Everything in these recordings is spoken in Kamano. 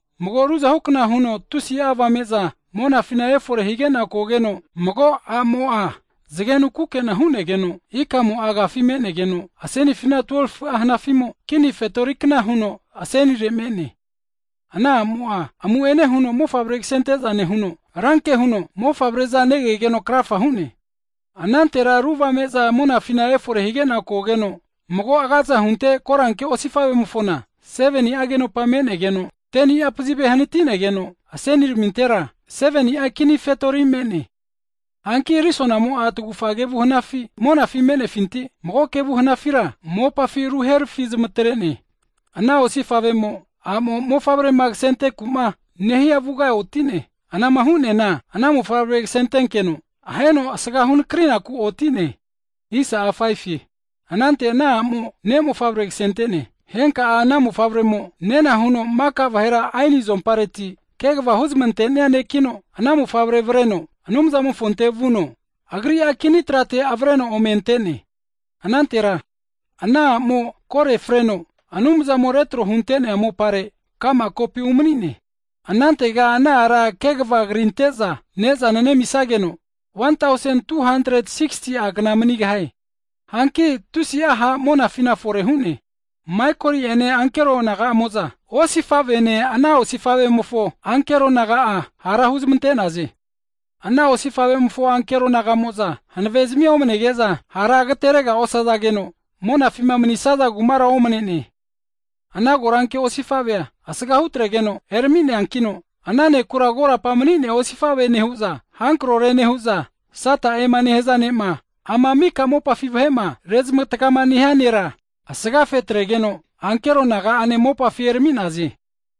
Mago ruzahukna huno tusi'a avame'za monafina efore higena kogeno, mago a'mo'a zgenu kukena hunegeno, ikamo'a agafi menegeno, asenifina 12fu'a hanafimo kini fetorikna huno asenire me'ne. Ana a'mo'a amu'ene huno mofavre kasenteza nehuno, ranke huno mofavre'za negegeno krafa hu'ne. Anantera ru avame'za monafina efore higena kogeno, mago agaza hunte koranke osifavemofona, 7ni'a agenopa me'negeno, 10ni'a pazive hanatinegeno, aseniramintera 7ni'a kini fetori me'ne. Hanki risonamo'a tagufa kevu hanafi monafi me'nefinti, mago kevu hanafira mopafi ruharfi huzmatrene. Ana osifavemo, a'mo'ma mofavrema kasentenaku'ma nehia avuga otine. Anama hu'neana ana mofavre kasentenkeno aheno asga hunakrinaku otine. Anante ana a'mo ne'mofavre ksente'ne. Henka'a ana mofavremo nena huno maka vahera aeni azompareti kegva huzmantenia ne'kino, ana mofavre avreno Anumzamofonte vuno, Agri'a kini trate avreno ome antene. Anantera ana a'mo kore freno Anumzamo retro hunte'nea mopare ka'ma kopi umanine. Anantega ana ara kegva krinte'za nezana nemisageno, 1,260ti'a kna manigahie. Hanki tusi'a ha' monafina fore hu'ne. Maikoli ene ankero naga'amo'za, osifavene ana osifavemofo ankero naga'a hara huzmante'naze. Ana osifavemofo ankero nagamo'za hanavezmia omnege'za, hara agateregara osazageno monafima manisaza kumara omnene. Ana koranke osifavea asgahutregeno erami'neankino, ana ne'kura korapa mani'nea osifave nehu'za, hankrore nehu'za, Sata'ema nehaza ne'ma ama mika mopafi vahema rezmatgama nehia nera, asgafetregeno ankero naga'ane mopafi erami'naze.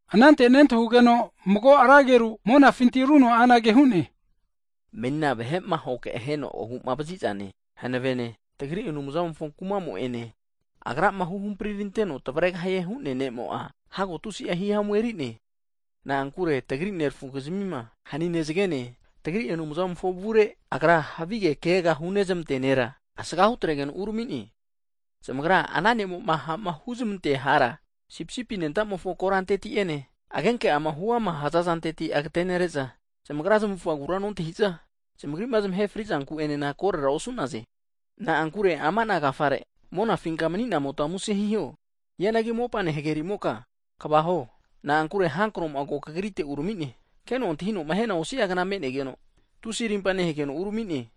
Anante nentahugeno mago ra ageru monafinti runo anage hu'ne, menina vahe'ma ahoke aheno agu'vazizane, hanavene, tagri Anumzamofo kumamo'ene Agrama huhampri'ranteno tavaregahie hu'nea nemo'a, hago tusi'a hihamu eri'ne. Na'ankure tagri nerafukizmima hanine zgene, tagri Anumzamofo avure agra havige kegaga hunezmantea nera asgahu atregeno urami'ne. Zamagra ana ne'mo'ma ha'ma huzmantea hara, Sipisipi anentamofo koranteti'ene agenke'ama huama hazareti agatenere'za, zamagra zmavufagura nontahi'za, zamagri'ma zmahe frizanku enena korera osu'naze. Na'ankure ama ana agafare, monafinka mni'namota muse hiho. Hianagi mopane hagerimoka kva hi'o, na'ankure hankromo'a tanaagrite ko uramine, keno antahinoma hiana osi'agna me'negeno, tusi rimpa nehegeno uramine.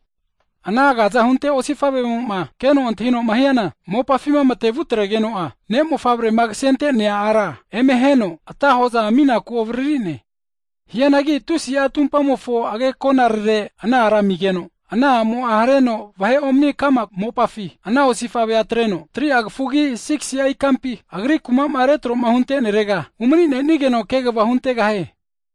Ana agaza hunte osifavemo'ma keno antahinoma hiana mopafima mate'mavutregeno'a, ne' mofavrema kasente'nea ara eme aheno atahoza ami'naku avaririne. Hianagi tusi'a tumpamofo agekonarere ana ara amigeno, ana a'mo'a hareno vahe omani kama mopafi, ana osifavea atreno, 3'a kafugi 6gisi'a ikampi agri kuma'ma retroma huntenerega umani'nenigeno kegva huntegahie.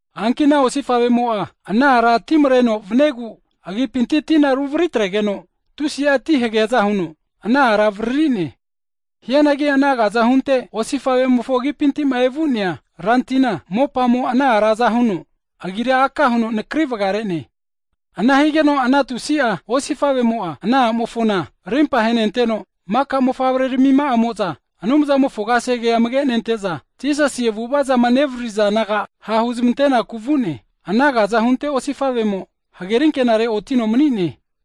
Hanki ana osifavemo'a, ana ara ti mreno vaniegu agipinti tina ruvaritregeno, tusi'a ti hageaza huno ana ara avaririne. Hianagi ana agaza hunte osifavemofo agipintima evu'nea rantina, mopamo ana ara aza huno, ana tina agira aka huno nakri vgare'ne. Ana higeno ana tusi'a osifavemo'a ana a'mofona rimpa ahenenteno, maka mofavrenaga'amo'za Anumzamofo kasege amage nente'za, Jisasi avu'avazama nevaririza naga ha' huzmante'naku vu'ne. Ana agaza hunte osifavemo hagerinkenare otino mni'ne.